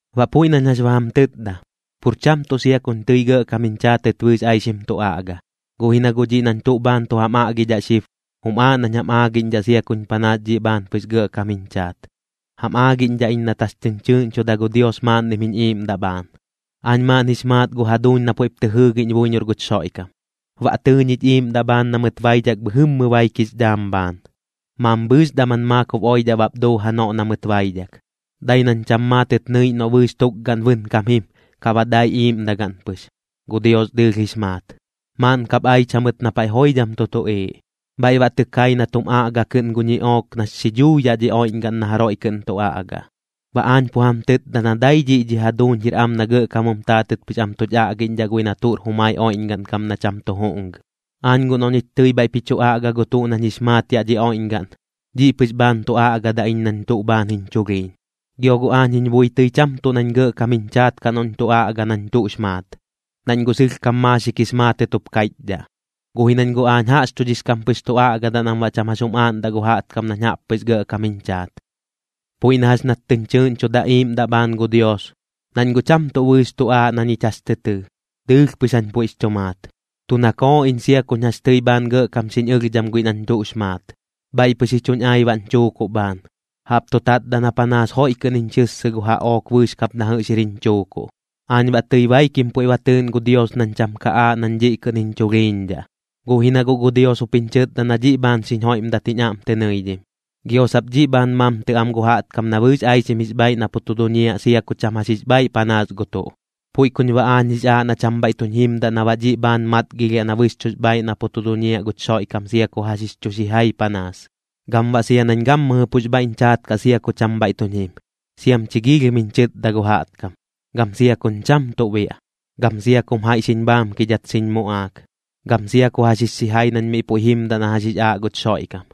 Baꞌ puiꞌ nañ jax ba jam tɨtda, pur cham tuꞌ sia kuñ tɨi gɇꞌkam jiñ chaatɨt bɨɨx aixim tu aꞌga, guꞌ ji na guꞌ dhiꞌ nañ tuꞌ bhaan tu jam aꞌgidhaꞌ xib, jum aaꞌ nañ jam aagiꞌñdhaꞌ sia kuñ panaas dhiꞌ bhaan pɨx gɇꞌkam jiñ chaat. Jam aagiꞌñdhaꞌ iñ nat jax tɨñ chɨɨꞌñchuda gu Dios maaꞌnnim jiñ iiꞌmdaꞌ bhaan. Aañ maaꞌn jix maat gu jaduuñ na puiꞌp tɨ jɨɨgiꞌñ buiñor guch Xoiꞌkam, baꞌ tɨɨ ñich iiꞌmdaꞌ bhaan na mɨt baidhak bhɨjɨmmɨ baik jix dhaam bhaan. Mambhɨɨx daman maakob oidhaꞌ bap duu janoꞌ na mɨt baidhak, dai nañ cham maatɨt nɨiꞌñ noꞌ bɨɨx tukgaꞌn bɨnkam jim, kaꞌ baꞌ dai iiꞌmdagaꞌn pɨx, gu Dios dɨɨlh jix maat. Maaꞌn kap aich jamɨt na paiꞌ joidham tu tuꞌiiꞌ, bhaiꞌ baꞌ tɨ kai na tum aꞌga kɨꞌn gu ñiꞌook nax xi dhuu yaꞌ dhi oiꞌñgaꞌn na jaroiꞌ kɨꞌn tu aꞌgaꞌ. Baꞌ aañ pu jam tɨtda na dai dhiꞌ dhi jaduuñ jir am na gɇꞌkam jum taatɨt pɨx am tuch aꞌgiꞌñdhaꞌ guiꞌ na tuꞌr jumai oiꞌñgaꞌn kam na cham tu juꞌngɨ. Aañ guꞌ noꞌ ñich tɨi bhaiꞌp ji chu aꞌga gu tuꞌ nañ jix maat yaꞌ dhi oiꞌñgaꞌn, dhiꞌ pɨx bhaan tu aꞌgadaꞌ iñ nañ tuꞌ bhaan jiñ chulhiiñ. Gio guꞌ aañ jiñ bui tɨi cham tuꞌ nañ gɇꞌkam jiñ chaat kaꞌ noꞌñ tu aꞌga nañ tuꞌx maat, nañ guꞌ sɨlhkam maaxik jix maatɨt jup kaiꞌchdhaꞌ. Guꞌ ji nañ guꞌ aañ jaꞌxchudhix kam pɨx tu aꞌgadaꞌ nam baꞌ cham jax jum aaꞌndaꞌ gu jaꞌtkam nañ jaꞌp pɨx gɇꞌkam jiñ chaat. Puiꞌ na jax nat tɨñ chɨɨꞌñchuda iiꞌmdaꞌ bhaan gu Dios, nañ guꞌ cham tuꞌ bɨɨx tu aaꞌ na ñich jax tɨ tɨɨ, dɨɨlh pɨx jañ puiꞌx chu maat. Tu nakooꞌ iñ sia kuñ jax tɨi bhaan gɇꞌkam xiñ ɨlhdham guiꞌ nañ tuꞌx maat, bhaiꞌ pɨx ji chuñ ai baꞌñ chuukuꞌ bhaan, jaꞌp tu tatdaꞌ na panaas joiꞌ kɨꞌn jiñ xɨssɨ gu jaꞌook bɨɨx kap na jɨꞌx jir jiñ chuukuꞌ. Aañ baꞌ tɨi baikim puiꞌ ba tɨɨꞌn gu Dios nañ cham ka aaꞌ nañ dhiꞌ kɨꞌn jiñ chulhiiñdhaꞌ. Guꞌ ji na guꞌ gu Dios jup jiñ chɨtda na dhiꞌ bhaan xiñ joiꞌmdat jiñ aꞌm tɨ nɨidhim, gio sap dhiꞌ bhaan mamtɨ am gu jaꞌtkam na bɨɨx aixim jix bhaaiꞌ na pu tu duñiaꞌ sia ku cham jax jix bhaaiꞌ panaas gu tuꞌ. Puiꞌ kuñ baꞌ aañ jix aaꞌ na cham bhaiꞌ tuñ jimdaꞌ na baꞌ dhiꞌ bhaan matgilhdhaꞌ na bɨxchuꞌx bhaaiꞌ na pu tu duñiaꞌ guch Xoiꞌkam sia ku jax jix chu xijai panaas. Gam baꞌ nañ gammɨjɨ pux bhaiꞌñ chaat kaꞌ sia ku cham bhaiꞌ tuñ jim, siam chi giilhim jiñ chɨtda gu jaꞌtkam, gam sia kuñ cham tuꞌ biaꞌ, gam sia kum jaiꞌ xiñ bhaamkidhat xiñ muꞌaak, gam sia ku jax jix xijai nañ miꞌ puiꞌ jimdaꞌ na jax jix aaꞌ guch Xoiꞌkam.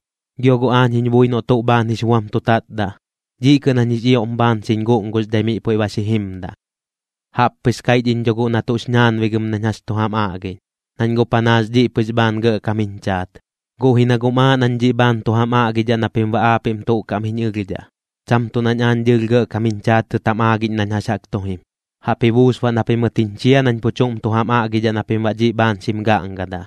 Gio guꞌ aañ jiñ bui noꞌ tuꞌ bhaan jix buam tu tatdaꞌ, dhiꞌ kɨꞌn jañ jix ioꞌm bhaan xiñ guꞌnguxdhai miꞌ puiꞌ ba xi jimdaꞌ. Jaꞌp pɨx kaiꞌch iñ dho guꞌ na tuꞌx ñaanbigɨm nañ jax chu jam aꞌgiꞌñ, nañ guꞌ panaas dhiꞌ pɨx bhaan gɇꞌkam jiñ chaat, guꞌ ji na guꞌm aaꞌ nañ dhiꞌ bhaan tu jam aꞌgidhaꞌ na pim baꞌ aapiꞌm tuꞌ kaꞌm jiñ ɨlhdhaꞌ, cham tuꞌ nañ aañ dɨɨlh gɇꞌkam jiñ chaatɨt jam aagiꞌñ nañ jax jaꞌk tu jim. Jaꞌp ji buus baꞌ na pimɨt jiñ chia nañ pu chuꞌm tu jam aꞌgidhaꞌ na pim baꞌ dhiꞌ bhaan xim gaꞌngadaꞌ.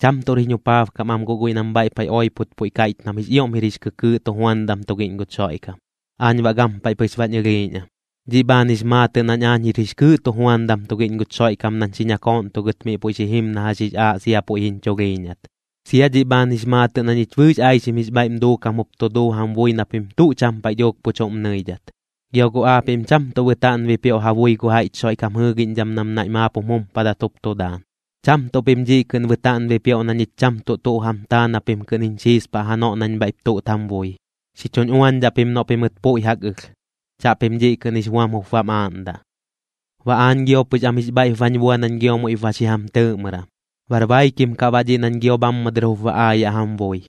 Cham tuꞌr jiñ jupaabkam am guꞌ guiꞌ nam bhaiꞌ paiꞌ oipot puiꞌ kaiꞌch nam jix ioꞌm jir jix kɨkɨɨꞌ tujuandam tugiꞌñ guch Xoiꞌkam, aañ baꞌ gampaiꞌ pɨx bañ ɨlhiiꞌñ am. Dhiꞌ bhaan jix maatɨꞌ nañ aañ jir jix kɨɨꞌ tujuandam tugiꞌñ guch Xoiꞌkam nañ xi ñakooꞌntugɨt miꞌ puiꞌ xi jim na jax jix aaꞌ sia puiꞌ jiñ chulhiiñat. Sia dhiꞌ bhaan jix maatɨꞌ na ñich bɨɨx aixim jix bhaiꞌm duukam jup tu duu jam bui na pim tuꞌ cham paiꞌ dhuuk pu chuꞌm nɨidhat. Gio guꞌ aapiꞌm cham tuꞌ bɨtaaꞌn bipioꞌ ja bui gu jaiꞌch Xoiꞌkam jɨɨgiꞌñdham nam naiꞌ maap jum jumpadat jup tu daan, cham tuꞌ pim dhiꞌ kɨꞌn bɨtaaꞌn bipioꞌ na ñich cham tuꞌ tuꞌ jam taa na pim kɨꞌn jiñ xiispaꞌ janoꞌ nañ bhaiꞌp tuꞌt jam bui. Xi chuñ uañdhaꞌ pim noꞌ pimɨt puiꞌ jaꞌk ɨlh, chaꞌpim dhiꞌ kɨꞌn jix buam jup bam aaꞌndaꞌ. Baꞌ aañ gio pɨx am jix bhaiꞌp bañ bua nañ gio muiꞌp ba xi jam tɨɨꞌmɨram, bar baikim kaꞌ baꞌ dhiꞌ nañ gio bhammɨ dɨr jup ba aayaꞌ jam bui.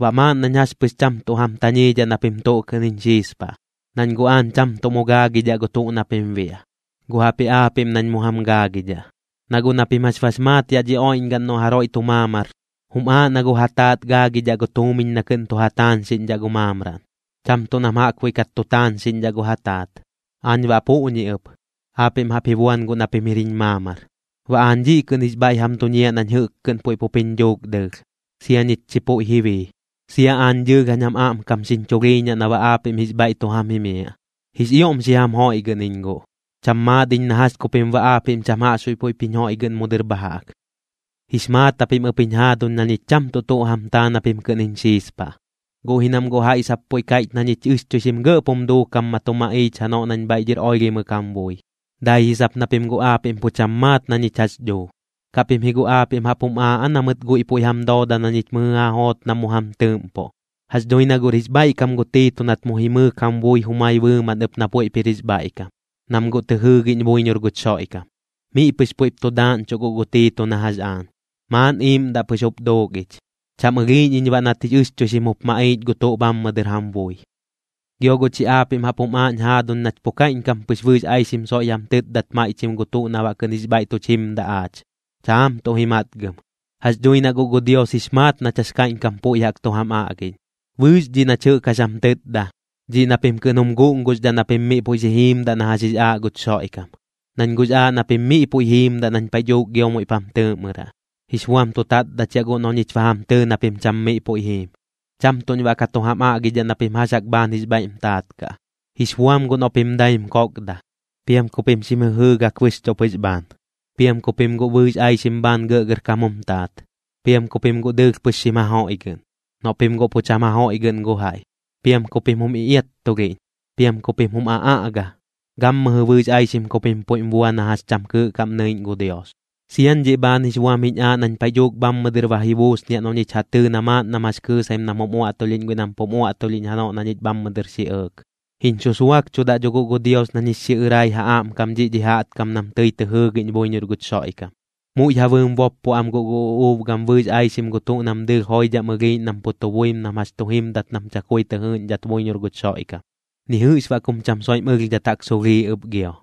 Baꞌ maaꞌn nañ jax pɨx cham tuꞌ jam tañiidhaꞌ na pim tuꞌ kɨꞌn jiñ xiispaꞌ, nañ guꞌ aañ cham tuꞌ mu gaagidhaꞌ gu tuꞌ na pim biaꞌ, guꞌ jaꞌpji aapiꞌm nañ mu jam gaagidhaꞌ. Na guꞌ na pim jax bax maat yaꞌ dhi oiꞌñgaꞌn noꞌ jaroiꞌ tu maamar, jum aaꞌ na gu ja taat gaagidhaꞌ gu tuumiñ na kɨꞌn tu ja taañxiꞌñdhaꞌ gu maamraꞌn, cham tuꞌ nam jaꞌkbuiꞌ kat tu taañxiꞌñdhaꞌ gu ja taat. Aañ baꞌ puꞌñi ɨp, aapiꞌm jaꞌp ji buan guꞌ na pim jir jiñ maamar. Baꞌ aañ dhiꞌ kɨꞌn jix bhaiꞌ jam duñiaꞌ nañ jɨꞌk kɨꞌn puiꞌ pup jiñ dhuuk dɨɨlh, sia ñich chi puiꞌ ji bii. Sia aañ dɨɨlh jañ jam aꞌmkam xiñ chulhiiñaꞌ na baꞌ aapiꞌm jix bhaiꞌ tu jam jimiaꞌ. Jix ioꞌm xi jam joiꞌgɨꞌn iñ guꞌ, cham maat iñ na jax ku pim baꞌ aapiꞌm cham jaꞌxbuiꞌ puiꞌp jiñ joiꞌgɨꞌn mu dɨr bha jaꞌk. Jix maat japim ɨp jiñ jaaduñ na ñich cham tuꞌ tuꞌ jam taa na pim kɨꞌn jiñ xiispaꞌ, guꞌ ji nam guꞌ jaiꞌ sap puiꞌ kaiꞌch na ñich ɨxchuixim gɇꞌp jum duukam ma tu maꞌiich janoꞌ nañ bhaiꞌ dhɨr oilhimɨk jam bui, dai ji sap na pim guꞌ aapiꞌm pu cham maat na ñich jax duu. ¿Kaꞌ pim ji guꞌ aapiꞌm jaꞌp jum aaꞌ aa na mɨt guiꞌ puiꞌ jam dooda na ñich mɨjɨ ja joot nam mu jam tɨɨꞌmpoꞌ? Jax dhui na guꞌr jix bhaiꞌkam gu Tiito nat mu jimɨɨk jam bui jumai bɨɨmaꞌn ɨp na puiꞌp jir jix bhaiꞌkam, nam guꞌ tɨ jɨɨgiꞌñ buiñor guch Xoiꞌkam. Miꞌ pɨx puiꞌp tu daaꞌñchuꞌ guꞌ gu Tiito na jax aañ, maaꞌn iiꞌmdaꞌ pɨx jup duuk ich, cham ɨlhiiꞌñ iñ baꞌ nat jix ɨxchuixim jup maꞌiich gu tuꞌ bhammɨ dɨr jam bui. Gio guꞌ chi aapiꞌm jaꞌp jum aaꞌñ jaaduñ nach pu kaiꞌñkam pɨx bɨɨx aixim soiꞌ jam tɨtdat maiꞌchim gu tuꞌ na baꞌ kɨꞌn jix bhaiꞌ tuch jimdaꞌ aach. Chaam tuꞌ ji matgɨm, jax dhui na guꞌ gu Dios jix maat nach jax kaiꞌñkam puiꞌ jaꞌk tu jam aꞌgiꞌñ. Bɨɨx dhiꞌ nach jɨꞌk jax jam tɨtda, dhiꞌ na pim kɨꞌn jum guꞌnguxdhaꞌ na pim miꞌ puiꞌ xi jiimdaꞌ na jax jix aaꞌ guch Xoiꞌkam. Nañ guꞌx aaꞌ na pim miꞌ puiꞌ jiimdaꞌ nañ paiꞌ dhuuk gio muiꞌp jam tɨɨꞌmɨraꞌ. Jix buam tu tatdachiaꞌ guꞌ noꞌ ñich ba jam tɨɨ na pim cham miꞌ puiꞌ jiim, cham tuꞌñ baꞌ ka tu jam aꞌgidhaꞌ na pim jax jaꞌk bhaan jix bhaiꞌm taat kaꞌ. Jix buam guꞌ noꞌ pim daim kokda, piam ku pim xim jɨjɨɨgak bɨxchuꞌ pɨx bhaan, piam ku pim guꞌ bɨɨx aixim bhaan gɇꞌgɇrkam jum taat, piam ku pim guꞌ dɨɨlh pɨx xim jajoiꞌgɨꞌn, noꞌ pim guꞌ pu cham jajoiꞌgɨꞌn gu jaiꞌ. Piam ku pim jum iꞌiattulhiꞌñ, piam ku pim jum aꞌaꞌga, gammɨjɨ bɨɨx aixim ku pim puiꞌm bua na jax cham kɨɨꞌ kaꞌm nɨiꞌñ gu Dios. Siañ dhiꞌ bhaan jix buam jiñ aaꞌ nañ paiꞌ dhuuk bhammɨ dɨr ba ji buusniaꞌ noꞌ ñich ja tɨɨ na maaꞌn nam jax kɨɨsaim nam jum uaꞌtulhiꞌñ guiꞌ nam pum uaꞌtulhiꞌñ janoꞌ na ñich bhammɨ dɨr xi ɇɇk. Jiñ xusuakchudaꞌ dho guꞌ gu Dios nañ jix xiꞌɨrai ja aꞌmkam dhiꞌ dhi jaꞌtkam nam tɨi tɨ jɨɨgiꞌñ buiñor guch Xoiꞌkam. Muiꞌ ja bɨɨm boppo am guꞌ gu uꞌuub gam bɨɨx aixim gu tuꞌ nam dɨɨlh joidham ɨlhiiꞌñ nam pu tu buim nam jax tu jimdat nam chakui tɨ jɨɨꞌñdhat buiñor guch Xoiꞌkam, ni jɨꞌx baꞌ kum cham soiꞌm ɨlhdhat jaꞌk sulhiiꞌ ɨp gio.